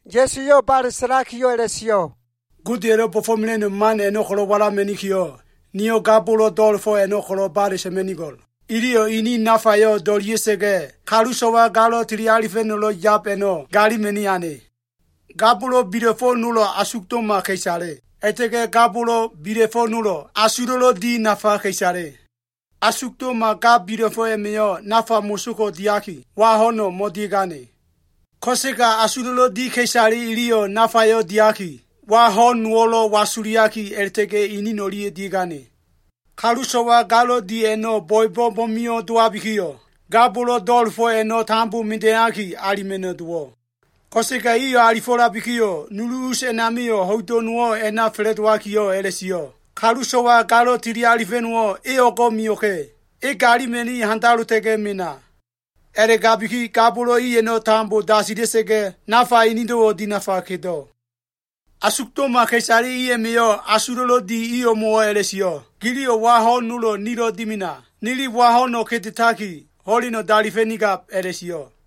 Ya꞉su eyo꞉ bale sa꞉lakiyo꞉ a꞉la꞉sio꞉, “Godeya꞉lo꞉ bo꞉fo꞉mela꞉no꞉ man a꞉no꞉ walama꞉nikiyo꞉, niyo꞉ ga bolo꞉ do꞉la꞉fo꞉ a꞉no꞉ ko꞉lo꞉ bale sa꞉ma꞉nigo꞉l. Iliyo꞉ ini nafayo꞉ do꞉lia꞉sa꞉ga꞉, kalu so꞉wa galo꞉ tili alifa꞉no꞉lo꞉ yab a꞉no꞉ galima꞉ni ane. Ga bolo꞉ bila꞉fo꞉ nolo꞉ asugdo꞉ma ka꞉isale, a꞉la꞉ta꞉ga꞉ ga bolo꞉ bila꞉fo꞉ nolo꞉ asulo꞉lo꞉ di nafa ka꞉isale. Asugdo꞉ma ga bila꞉fo꞉ a꞉ma꞉yo꞉ nafa moso ko꞉ diaki, wa ho꞉no꞉ mo꞉dia꞉gane. Ko꞉sega asulo꞉lo꞉ di ka꞉isale iliyo꞉ nafayo꞉ diaki, wa ho꞉n nowo꞉lo꞉ wasuliaki a꞉la꞉ta꞉ga꞉ inin o꞉lia꞉ dia꞉gane. Kalu so꞉wa galo꞉ dia꞉no꞉ a꞉no꞉ bo꞉ebo꞉ mo꞉mio꞉ dowabikiyo꞉, ga bolo꞉ do꞉la꞉fo꞉ a꞉no꞉ tambo mida꞉iyaki alima꞉no꞉ dowo꞉. Ko꞉sega iyo꞉ alifo꞉labikiyo꞉, nulu us a꞉namio꞉ ho꞉ido꞉ nowo꞉ a꞉na fa꞉la꞉dowakiyo꞉ a꞉la꞉sio꞉, ‘Kalu so꞉wa galo꞉ tili alifa꞉no꞉wo꞉ e o꞉go꞉ mio꞉ka꞉! E galima꞉ni handalota꞉ga꞉ meno꞉.’ A꞉la꞉gabiki ga bolo꞉ i a꞉no꞉ tambo dasila꞉sa꞉ga꞉, nafa inido꞉wo꞉ dinafa kedo꞉. Asugdo꞉ma ka꞉isale a꞉ma꞉yo꞉ asulo꞉lo꞉ di i o꞉mo꞉wo꞉ a꞉la꞉sio꞉, ‘Giliyo꞉ wa ho꞉n nolo꞉ nilo꞉ dimena. Nili wa ho꞉no꞉ kedetaki, ho꞉leno꞉ dalifa꞉nigab,’ a꞉la꞉sio꞉.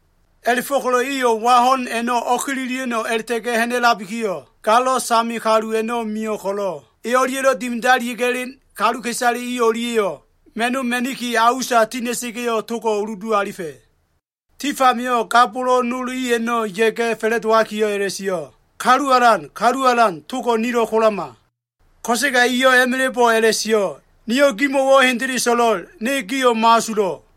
A꞉la꞉fo꞉ko꞉lo꞉ iyo꞉ wa ho꞉n a꞉no꞉ o꞉kililia꞉no꞉ a꞉la꞉ta꞉ga꞉ ha꞉na꞉labikiyo꞉, galo꞉ same kalu a꞉no꞉ mio꞉ ko꞉lo꞉, e o꞉lia꞉ dimidalia꞉ga꞉ elen ka꞉isale i o꞉lia꞉yo꞉ ma꞉no꞉ ma꞉niki a usa tina꞉sa꞉ga꞉yo꞉, togo꞉ uludu alifa꞉. Tif amio꞉ ga bolo꞉ nol i a꞉no꞉ ya꞉ga꞉ fa꞉la꞉dowakiyo꞉ a꞉la꞉sio꞉, ‘Kalu Alan, Kalu Alan togo꞉ nilo꞉ kolama.’ Ko꞉sega eyo꞉ a꞉ma꞉la꞉bo꞉ a꞉la꞉sio꞉, ‘Niyo꞉ gimo꞉wo꞉ hendele so꞉lo꞉l. Ne gio꞉ mo꞉asulo꞉.’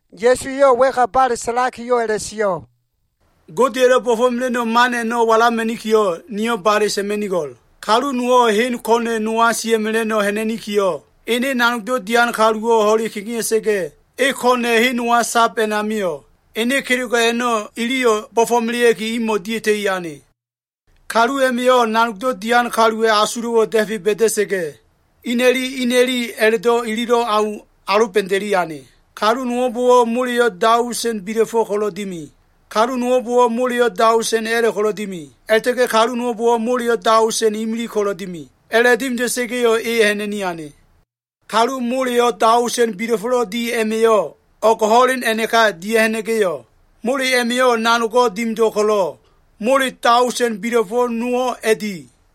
Ya꞉su eyo꞉ wa꞉ka bale sa꞉lakiyo꞉ a꞉la꞉sio꞉, “Godeya꞉lo꞉ bo꞉fo꞉mela꞉no꞉ man a꞉no꞉ walama꞉nikiyo꞉, niyo꞉ bale sa꞉ma꞉nigo꞉l. Kalu nowo꞉ hen ko꞉na꞉ nowa sia꞉mela꞉no꞉ ha꞉na꞉nikiyo꞉, ene nanogdo꞉ dian kaluwo꞉ ho꞉le kegea꞉sa꞉ga꞉, e ko꞉na꞉ hen nowa sab a꞉namio꞉ ene kelego꞉ a꞉no꞉ iliyo꞉ bo꞉fo꞉melea꞉ki, imo꞉ dia꞉ta꞉i ane. Kalu a꞉ma꞉yo꞉ nanogdo꞉ dian kaluwa꞉ asulo꞉wo꞉ da꞉fe ba꞉da꞉sa꞉ga꞉, ina꞉li ina꞉li a꞉la꞉do꞉ ililo꞉ au aloba꞉da꞉i ane. Kalu nowo꞉mbo꞉wo꞉ moleyo꞉ daosen bila꞉fo꞉ ko꞉lo꞉ dimi. Kalu nowo꞉mbo꞉wo꞉ moleyo꞉ daosen a꞉la꞉ ko꞉lo꞉ dimi. A꞉la꞉ta꞉ga꞉ kalu nowo꞉mbo꞉wo꞉ moleyo꞉ daosen imilig ko꞉lo꞉ dimi. A꞉la꞉dimida꞉sa꞉ga꞉yo꞉ e ha꞉na꞉ni ane. Kalu mole daosen bila꞉fo꞉lo꞉ di a꞉ma꞉yo꞉ o꞉g ho꞉len a꞉naka dia꞉ha꞉na꞉ga꞉yo꞉, mole a꞉ma꞉yo꞉ nanogo꞉ dimido꞉ kolo꞉, mole daoseno꞉ bila꞉fo꞉ nowo꞉ a꞉di.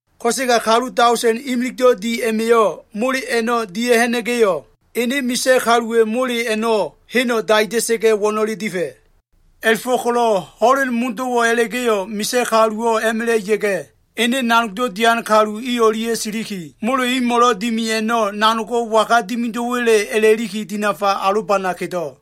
Ko꞉sega kalu daosen imiligdo꞉ di a꞉ma꞉yo꞉ mole a꞉no꞉ dia꞉ha꞉na꞉sa꞉ga꞉yo꞉, ene misa꞉ kaluwa꞉ mole a꞉no꞉ heno꞉ daida꞉sa꞉ga꞉ wo꞉no꞉le difa꞉. “A꞉la꞉fo꞉ko꞉lo꞉ ho꞉len modo꞉wo꞉ a꞉la꞉ga꞉yo꞉, misa꞉ kaluwo꞉ a꞉ma꞉la꞉ ya꞉ga꞉, ene nanogdo꞉ dian kalu i o꞉lia꞉ siliki, mole imo꞉lo꞉ dimi a꞉no꞉ nanogo꞉ waga dimido꞉wa꞉le a꞉la꞉liki dinafa alobana kedo꞉.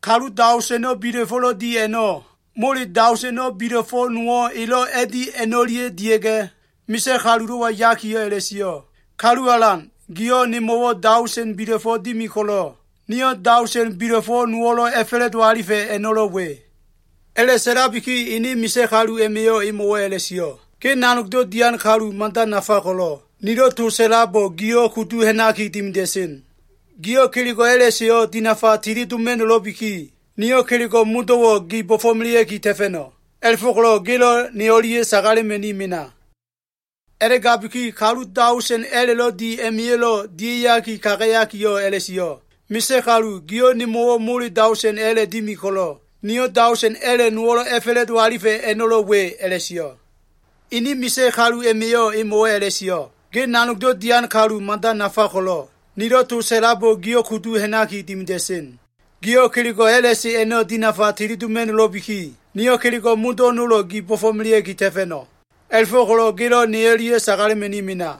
Kalu daoseno꞉ bila꞉fo꞉lo꞉ di a꞉no꞉, mole daoseno꞉ bila꞉fo꞉ nowo꞉ elo꞉ a꞉di a꞉no꞉lia꞉ dia꞉ga꞉, misa꞉ kalulo꞉wa yakiyo꞉ a꞉la꞉sio꞉, ‘Kalu alan, giyo꞉ nemo꞉wo꞉ daosen bila꞉fo꞉ dimi ko꞉lo꞉, niyo꞉ daosen bila꞉fo꞉ nowo꞉ a꞉fa꞉la꞉do alifa꞉ a꞉no꞉lo꞉ we.’ A꞉la꞉sa꞉labiki ene misa꞉ kalu a꞉ma꞉yo꞉ emo꞉wo꞉ a꞉la꞉sio꞉, ‘Ge nanogdo꞉ dian kalu mada nafa ko꞉lo꞉, nilo꞉ to sa꞉labo꞉ giyo꞉ kudu ha꞉naki dimida꞉sen. Giyo꞉ kelego꞉ a꞉la꞉seyo꞉ dinafa tili doma꞉no꞉lo꞉biki, niyo꞉ kelego꞉ modo꞉wo꞉ gi bo꞉fo꞉melea꞉ki ta꞉fa꞉no꞉. A꞉la꞉fo꞉ko꞉lo꞉ gelo꞉ ne o꞉lia꞉ sagalema꞉ni mena.’ “A꞉la꞉gabiki kalu daosen a꞉la꞉lo꞉ di a꞉ma꞉yo꞉lo꞉ dia꞉ya꞉ga꞉ kagayakiyo꞉ a꞉la꞉sio꞉, ‘Misa꞉ kalu gio꞉ nemo꞉wo꞉ mole daosen a꞉la꞉ dimi ko꞉lo꞉, niyo꞉ daosen a꞉la꞉ nowo꞉ a꞉fa꞉la꞉do alifa꞉ a꞉no꞉lo꞉ we,’ a꞉la꞉sio꞉. Ene misa꞉ kalu a꞉ma꞉yo꞉ emo꞉wo꞉ a꞉la꞉sio꞉, ‘Ge nanogdo꞉ dian kalu mada nafa ko꞉lo꞉, nilo꞉ to sa꞉labo꞉ giyo꞉ kudu ha꞉naki dimida꞉sen. Giyo꞉ kelego꞉ a꞉la꞉se a꞉no꞉ dinafa tili doma꞉no꞉lo꞉biki, niyo꞉ kelego꞉ modo꞉ nolo꞉ gi bo꞉fo꞉melea꞉ki ta꞉fa꞉no꞉. A꞉la꞉fo꞉ko꞉lo꞉ gelo꞉ ne o꞉lia꞉ sagalema꞉ni mena.’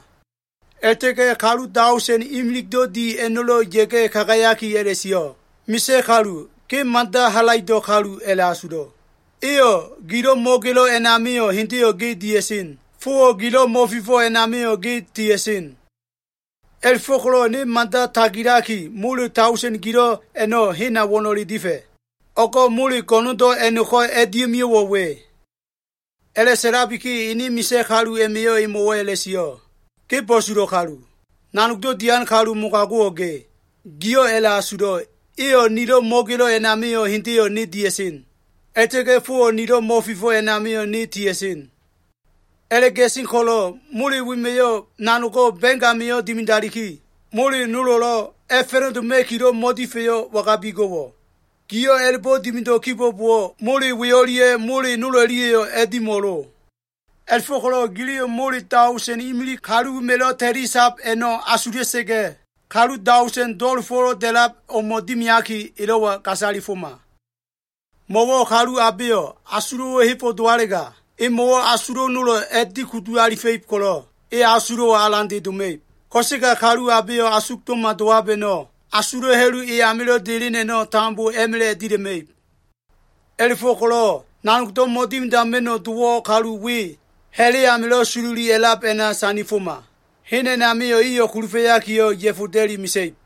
“A꞉la꞉ta꞉ga꞉ kalu daosen imiligdo꞉ di a꞉no꞉lo꞉ ya꞉ga꞉ kagayaki a꞉la꞉sio꞉, ‘Misa꞉ kalu, ge mada halaido꞉ kalu a꞉la꞉asulo꞉. Eyo꞉ gilo꞉ mo꞉gelo꞉ a꞉namio꞉ hendeyo꞉ ge dia꞉sen. Fowo꞉ gilo꞉ mo꞉fifo꞉ a꞉namio꞉, ge tia꞉sen. A꞉la꞉fo꞉ko꞉lo꞉ ne mada tagilaki, mole daosen gilo꞉ a꞉no꞉ hena wo꞉no꞉le difa꞉. O꞉go꞉ mole go꞉no꞉ndo꞉ a꞉no꞉ko꞉ a꞉dia꞉mio꞉wo꞉ we.’ “A꞉la꞉sa꞉labiki ene misa꞉ kalu a꞉ma꞉yo꞉ emo꞉wo꞉ a꞉la꞉sio꞉, ‘Ge bo꞉sulo꞉ kalu. Nanogdo꞉ dian kalu mogago꞉wo꞉ ge. Giyo꞉ a꞉la꞉asulo꞉, eyo꞉ nilo꞉ mo꞉gelo꞉ a꞉namio꞉ hendeyo꞉ ne dia꞉sen. A꞉la꞉ta꞉ga꞉ fowo꞉ nilo꞉ mo꞉fifo꞉ a꞉namio꞉, ne tia꞉sen. A꞉la꞉gasen ko꞉lo꞉, mole wema꞉yo꞉ nanogo꞉ ba꞉ng amio꞉ dimidaliki, mole nolo꞉lo꞉ a꞉fa꞉la꞉doma꞉kilo꞉ mo꞉difa꞉yo꞉ wangabi go꞉wo꞉? Giyo꞉ a꞉la꞉bo꞉ dimido꞉ kibo꞉bowo꞉, mole we o꞉lia꞉ mole nol o꞉lia꞉yo꞉ a꞉dimo꞉lo. A꞉la꞉fo꞉ko꞉lo꞉ giliyo꞉ mole daosen imilig kalu wema꞉lo꞉ ta꞉lisab a꞉no꞉ asula꞉sa꞉ga꞉, kalu daosen do꞉la꞉fo꞉lo꞉ da꞉lab o꞉mo꞉ dimiaki, elo꞉wa gasalifoma. Mo꞉wo꞉ kalu abeyo꞉ asulo꞉wo꞉ hebo꞉ dowalega, emo꞉wo꞉ asulo꞉ nolo꞉ a꞉dikudu alifa꞉ib ko꞉lo꞉, e asulo꞉wo꞉ alande doma꞉ib. Ko꞉sega kalu abeyo꞉ asugdo꞉ma dowab a꞉no꞉, asulo꞉ ha꞉lu e amilo꞉ delen a꞉no꞉, tambo a꞉ma꞉la꞉ dila꞉ma꞉ib. A꞉la꞉go꞉ko꞉lo꞉ nanogdo꞉ mo꞉dimidama꞉no꞉ dowo꞉ kalu we ha꞉la꞉ amilo꞉ sololi a꞉lab a꞉na sandifoma. Hen a꞉namio꞉ eyo꞉ kulufa꞉yakiyo꞉, ya꞉foda꞉li mesa꞉ib.’”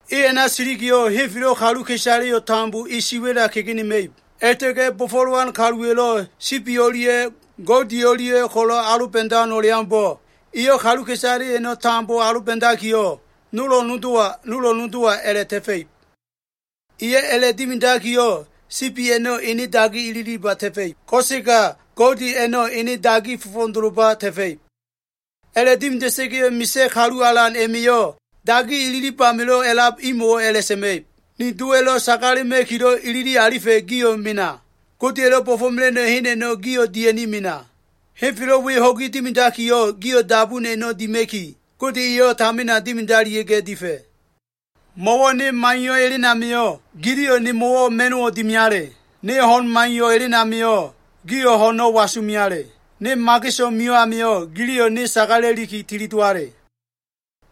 E a꞉na silikiyo꞉, henfelo꞉ kaluka꞉isaleyo꞉ tambo e siwa꞉la kegenema꞉ib. A꞉la꞉ta꞉ga꞉ bo꞉fo꞉lowan kaluwa꞉lo꞉ sibi o꞉lia꞉ goudi o꞉lia꞉ ko꞉lo꞉ aloba꞉dan o꞉leaumbo꞉, eyo꞉ kaluka꞉isale a꞉no꞉ tambo aloba꞉dakiyo꞉, nolo꞉ nodowa, nolo꞉ nodowa a꞉la꞉ ta꞉fa꞉ib. Eyo꞉ a꞉la꞉dimidakiyo꞉, sibi a꞉no꞉ ene dagi ililiba ta꞉fa꞉ib. Ko꞉sega goudi a꞉no꞉ ene dagi fo꞉fo꞉doloba ta꞉fa꞉ib. “A꞉la꞉dimida꞉sa꞉ga꞉yo꞉ Misa꞉ Kalu Alan a꞉ma꞉yo꞉ dagi ililib amilo꞉ a꞉lab imo꞉wo꞉ a꞉la꞉sa꞉ma꞉ib, ‘Ni Dowa꞉lo꞉ sagalema꞉kilo꞉ ilili alifa꞉, gio꞉ mena. Godeya꞉lo꞉ bo꞉fo꞉mela꞉no꞉ hen a꞉no꞉ gio꞉ dia꞉ni mena. Henfelo꞉ we ho꞉gi dimidakiyo꞉, gio꞉ dabun a꞉no꞉ dima꞉ki, Gode eyo꞉ tamina dimidalia꞉ga꞉ difa꞉. Mo꞉wo꞉ ne maiyo꞉ elen amio꞉, giliyo꞉ nemo꞉wo꞉ ma꞉no꞉ dimiale. Ne ho꞉n maiyo꞉ elen amio꞉, gio꞉ ho꞉no꞉ wasu meale. Ne mageso꞉ mio꞉ amio꞉, giliyo꞉ ne sagala꞉liki tilidowale.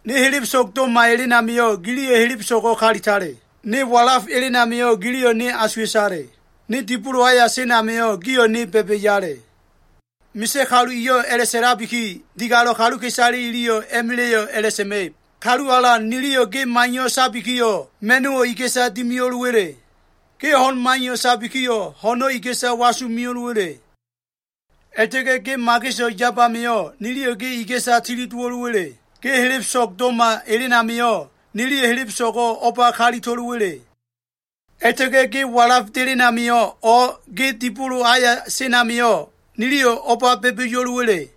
Ne helebeso꞉g do꞉ma elen amio꞉, giliyo꞉ helebeso꞉go꞉ kalitale. Ne walaf elen amio꞉, giliyo꞉ ne asuwa꞉tale. Ne dibolo aya sen amio꞉, gio꞉ ne ba꞉ba꞉yale.’ Misa꞉ Kalu eyo꞉ a꞉la꞉sa꞉labiki, digalo꞉ kaluka꞉isale iliyo꞉ a꞉ma꞉la꞉yo꞉ a꞉la꞉sa꞉ma꞉ib, ‘Kalu Alan niliyo꞉ ge maiyo꞉ sabikiyo꞉, ma꞉no꞉wo꞉ iga꞉sa dimiyo꞉lowa꞉le? Ge ho꞉n maiyo꞉ sabikiyo꞉, ho꞉no꞉ iga꞉sa wasu meo꞉lowa꞉le? A꞉la꞉ta꞉ga꞉ ge mageso꞉ yab amio꞉ niliyo꞉ ge iga꞉sa tilidowo꞉wa꞉le? Ge helebeso꞉g do꞉ma elen amio꞉, niliyo꞉ helebeso꞉go꞉ o꞉ba kalito꞉lowa꞉le? A꞉la꞉ta꞉ga꞉ ge walaf delen amio꞉, o꞉ ge dibolo aya sen amio꞉, niliyo꞉ o꞉ba ba꞉ba꞉yo꞉lowa꞉le?’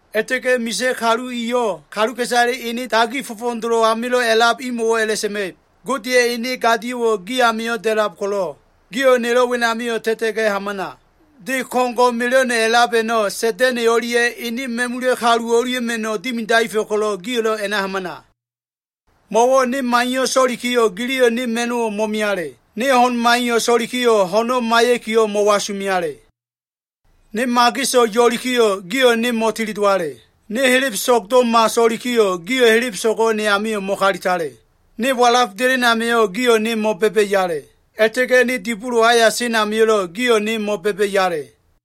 “A꞉la꞉ta꞉ga꞉ Misa꞉ Kalu eyo꞉ kaluka꞉isale ene dagi fo꞉fo꞉dolo꞉ amilo꞉ a꞉lab imo꞉wo꞉ a꞉la꞉sa꞉ma꞉ib, ‘Godeya꞉ ene gadio꞉wo꞉ gi amio꞉ da꞉lab ko꞉lo꞉, gio꞉ nelo꞉ wenamio꞉ ta꞉ta꞉ga꞉ hamana. De ko꞉ngo꞉ mela꞉no꞉ a꞉lab a꞉no꞉ Sa꞉da꞉na꞉ o꞉lia꞉ ene ma꞉mula꞉ kalu o꞉lia꞉ma꞉no꞉ dimidaefa꞉ ko꞉lo꞉, gio꞉lo꞉ a꞉na hamana! Mo꞉wo꞉ ne maiyo꞉ so꞉likiyo꞉, giliyo꞉ ne ma꞉no꞉wo꞉ mo꞉miale. Ne ho꞉n maiyo꞉ so꞉likiyo꞉, ho꞉no꞉ maiya꞉kiyo꞉ mo꞉wasumeale. Ne mageso꞉ yo꞉likiyo꞉, gio꞉ ne mo꞉tilidowale. Ne helebeso꞉g do꞉ma so꞉likiyo꞉, gio꞉ helebeso꞉go꞉ ne amio꞉ mo꞉kalitale. Ne walaf delen amio꞉, gio꞉ ne mo꞉ba꞉ba꞉yale. A꞉la꞉ta꞉ga꞉ ne dibolo aya sen amio꞉lo꞉, gio꞉ ne mo꞉ba꞉ba꞉yale.’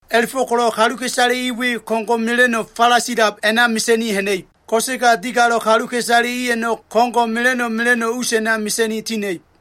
A꞉la꞉fo꞉ko꞉lo꞉ kaluka꞉isale i we ko꞉ngo꞉ mela꞉no꞉ falasilab a꞉na mesa꞉ni ha꞉na꞉ib. Ko꞉sega digalo꞉ kaluka꞉isale i a꞉no꞉, ko꞉ngo꞉ mela꞉no꞉ mela꞉no꞉ us a꞉na mesa꞉ni tina꞉ib.”